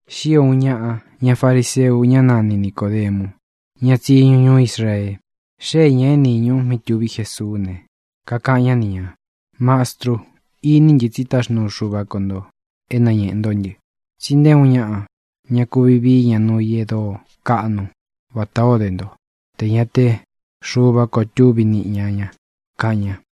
Xío ūun ñaꞌa ña fariseu, ñá nani Nicōdemu, ñá tsiñu ñuú Israee. Xée ñā é nīñu mí tuví Jesuú ne, kakaꞌan ñá ni ñā: —Mastru, iní ntɨ tsí taxnuu Xuva ko ntō é nañeꞌē ntó ntɨ. Tsí nté uun ñaꞌa ña kuvi vií ña nuu i e dóo kaꞌnu vatā ó de nto tē ña te Xuva ko túvi niꞌi ña ña —kaꞌan ña.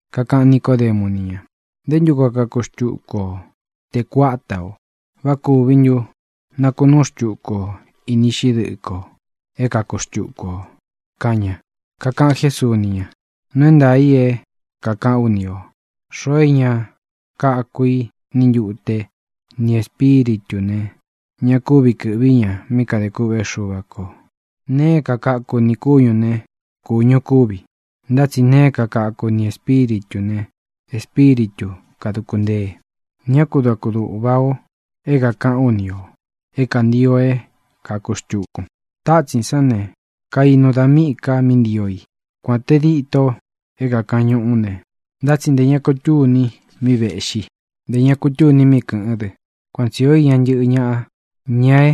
Kakaꞌan Nicódemu ni ña: —¿Nté ntu koo kaku xtuku o tē kuáta ō? ¿Vá kūvi ntu nakunuu xtuku o ini iꞌxí dɨꞌɨ kō é kaku xtuku ō? —kaꞌan ña. Kakaꞌan Jésuu ni ña: —Nuu é ntaā i é kākaꞌán u ni ō: Xoo é ña kaku i ni ntute ni Ēspíritū ne, ña kúvi kɨ̄ꞌví ña mí kadē kûꞌvé Xuva kō. Nee é kakaku nī kúñū né, kūñu kúvi; ntá tsi nee é kakaku ni Ēspíritū ne, Espíritu kāduku ntée. Ñá ku da kudūꞌva o é kākaꞌán u ni ō é kantio é kāku xtukun. Tátsīn sán ne, kainu da míꞌī ka mí ntio i. Kuān te díto é kākaꞌan ñuꞌú ne, ntá tsi ntē ña kutúni mí vēꞌxí, ntē ña kutúni mí kɨ̄ꞌɨ́n dɨ. Kuan tsi īó iña un ntɨ́ꞌɨ ñāꞌa, ña é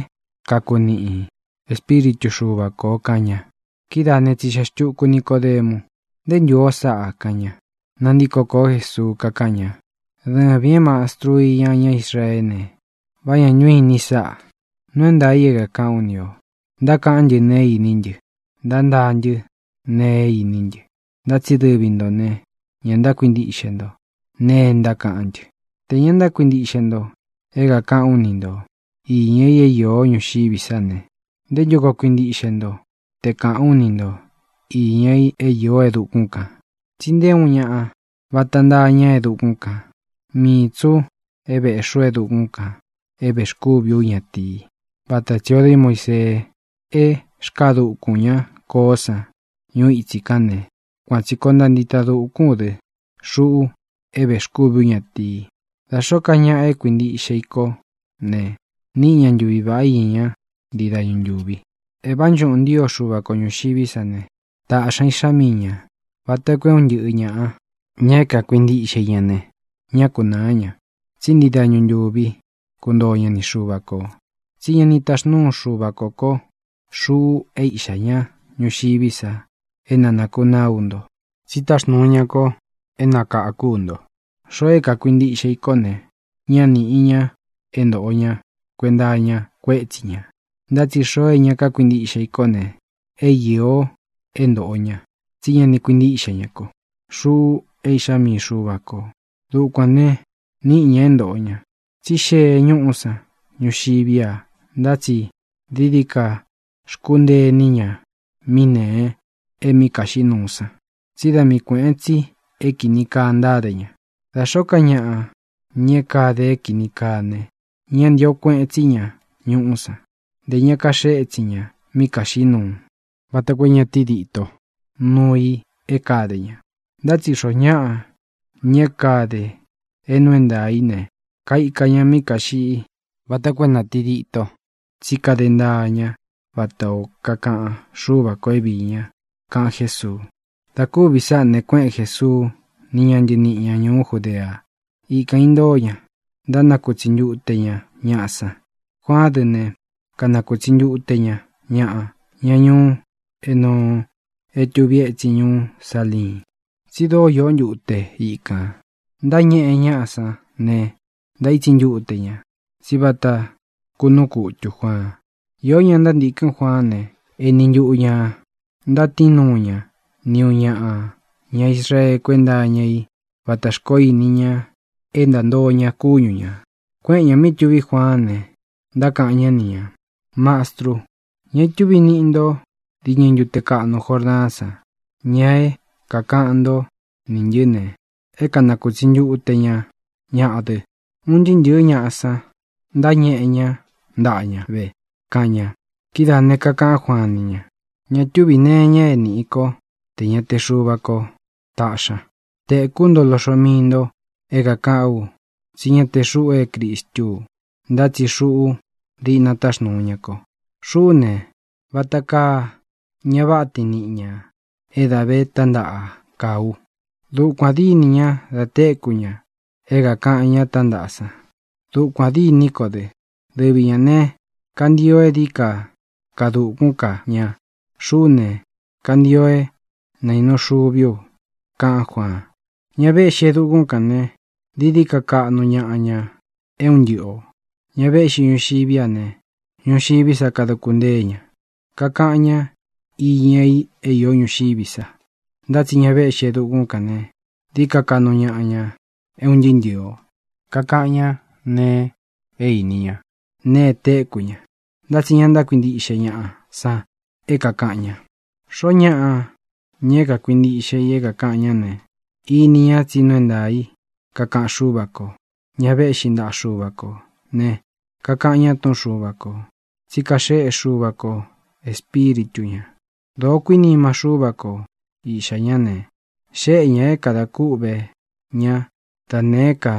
kakuniꞌi Ēspíritu Xuva kō —kaꞌan ña. Kidáā né, tsixeꞌe xtuku Nicōdemu: —¿Nté ntū ó sáꞌa? —kaꞌan ña. Nantíko kōó Jesuu, kakáꞌan ña: —Dɨvīn é mastrun iña ñá Israeé ne, ¿vá ña ntu inin sáꞌā? Nuu é ntaā i é kākaꞌán u ni ō. Ntákaꞌán ntɨ nēe é īní ntɨ. Ntántaa ntɨ́ nēe é iní ntɨ, ntá tsi dɨvi ntō ne, ña ntákuintiꞌxe nto nēe é ntákaꞌán ntɨ. Tē ña ntákuintiꞌxe nto é kākaꞌán u ni nto iña i é īó ñuxiví sa ne, ¿nté ntu koo kuintiꞌxe nto te kāꞌán u ni ntō iña i é īó e dukún kān? ʼTsi nté uun ñāꞌa vata ntaa ña e dukún kān. Mii tsī u é vēꞌxí u e dukún kān é vēxkúvi ú ñatīi. Vata tsī o dé Muisee é xkaa dukūn ñá koó san ñuu itsí kān né, kuan tsī koo ntaa ntita dūkún u dɨ, xuꞌu é vēxkúvi ú ñatīi. Da xōó ka ñaꞌa é kuīntiꞌxe i kó ne, níꞌi ña ntuvi vāꞌá iña ña ntii dañu ntúvi. ʼE vánchuꞌūn ntío Xuva ko ñūxiví sa ne, tāꞌxi ña Iꞌxá mii ñā, vata koo é un ntɨꞌɨ ñāꞌa, ña é kakuintiꞌxe i ña ne, ñá kunāá ña, tsí ntii dañu ntuvi kuntoo ña ni Xuva kō. Tsi ñá ni taxnuu Xuvā kó ko, xuꞌu é Iꞌxā ñá, ñuxiví sa é na nākunaá u nto, tsí táxnūu ña ko é nakākú u nto. ʼXoo é kākuintiꞌxe i kó ne, ñá nīꞌi ña é ntōꞌo ña kuenta iña kuétsi ña. Ntá tsi xoo é ña kákuintiꞌxe i kó ne, é īo é ntōꞌo ña, tsí ña ni kuintíꞌxe ña ko, xuꞌu é Iꞌxá mii Xuva kō. Dukuān ne, níꞌi ña é ntōꞌo ña, tsí xee ñúꞌú san ñuxiví a, ntá tsi dií dií ka xkúntee iní ña mí nēe é mí kaxiꞌí nuu san, tsí da mii kuēꞌen tsi é kīni kaa ntáde ña. Da xōó ka ñaꞌa, ña é kade é kīni kaa ne, ña ntío kueꞌen tsí ña ñuꞌú san. Ntē ña kaxee étsin ña mí kāxiꞌí nuu, vata koo é ña tídito nuu i é kāde ña. Ntá tsi xoo ñáꞌa, ña é kade é nuu é ntaā í ne, kaika ña mí kāxiꞌí vata koo é na tīdito tsí kade ntaa ña vatā ó kakaꞌan Xúva kō é viī ña —kaꞌan Jésuu. Dā kúvī sáꞌā ne, kuéꞌen Jēsuu ni ña ntɨníꞌi ña ñūú Judea. Ikān intóo ña, ntánakutsi ntute ña ñaꞌa san. Juaán dɨ ne, kanakūtsi ntute ña ñaꞌa, ña ñuú Enoo é tuvi étsin ñuú Saliin, tsí dóo iō ntúte ikān. Ntáñeꞌe ñáꞌa san ne, ntaítsi ntute ña. Tsí vata kúnuu kutū Juaan. Íō ña ntántīkɨ́n Juaán ne, eni ntuꞌu ñā ntátiin nuu ña nī uun ñaꞌa ña Israee kuénta iña í vatā xkoó ini ña é ntántoo ña kúñu ñā. Kuéꞌen ñā mí tuví Juaán ne, ntákaꞌan ñá ni ñā: —Mastru, ña itúvi niꞌi nto diñɨ ntute kaꞌnu Jordaán san, ña é kākaꞌan ntó nī ntɨ́ ne, é kanakūtsi ntute ña ñaꞌa dɨ. Un ntɨɨ́ ntɨ̄ɨ́ ñaꞌa san ntáñeꞌe ñá ntaꞌa ña ve —kaꞌan ña. Kidáā ne, kakaꞌán Juaan ni ña: —Ña túvī nee iña é nīꞌi kó tē ña te Xuva ko táꞌxi ña. Tēkú nto loꞌxo mii ntō é kākaꞌán u tsí ña te xuꞌu é Cristú u, ntá tsi xuꞌu diꞌna táxnūu ña ko. Xuꞌú ne, vata kaa ña váꞌa tiin niꞌī ña é da vé tántaꞌa kaa u. Dukuān dîni ña da téku ña é kākaꞌan ñá tántaꞌa san. Dukuān dîní ko dɨ. Dɨvi ñā ne, kantio é dií ka kaa dukún ka ña. Xuꞌú ne, kantio é nainu xuví u —kaꞌán Juaan. Ña véꞌxi e dukún kān ne, dií dií ka kaꞌnu ñaꞌa ña é un ntɨꞌɨ ō. Ña véꞌxi ñuxiví a ne, ñuxiví sa kaduku ntée ña. Kakaꞌan ñá iña i é īó ñuxiví sa. Ntá tsi ña véꞌxi e dukún kān ne, dií ka kaꞌnu ñaꞌa ña é un ntɨɨ́ ntɨɨ̄ o. Kakaꞌan ñá nēe é īni ñá, nēe e téku ña, ntá tsi ña ntákuintiꞌxe ñaꞌa san é kākaꞌan ña. Xoó ñaꞌa, ña é kakuintiꞌxe i é kākaꞌan ñá ne, ini ña tsí nuu é ntaā í kakaꞌan Xúva kō. Ña véꞌxi ntaꞌa Xuva kō ne, kakaꞌan ña túꞌun Xuva kō, tsi kaxéꞌe Xuva kō Espíritu ñā. Dōó kuinima Xúva ko Iꞌxā ñá ne, xéꞌe ñā é kadā kúꞌvē ñá da nēé ka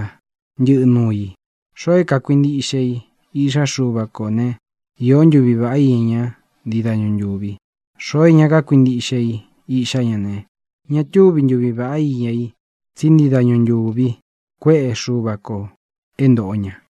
ntɨꞌɨ nuu i. Xoo é kākuintiꞌxe i Iꞌxá Xuva kō ne, īó ntuvi vāꞌá iña ña ntii dañu ntúvi. Xoo é ña kakuintiꞌxe i Iꞌxá ña ne, ña túvi ntuvi vāꞌá iña i tsí ntii dañu ntūvi kuéꞌe Xuva kō é ntōꞌo ña.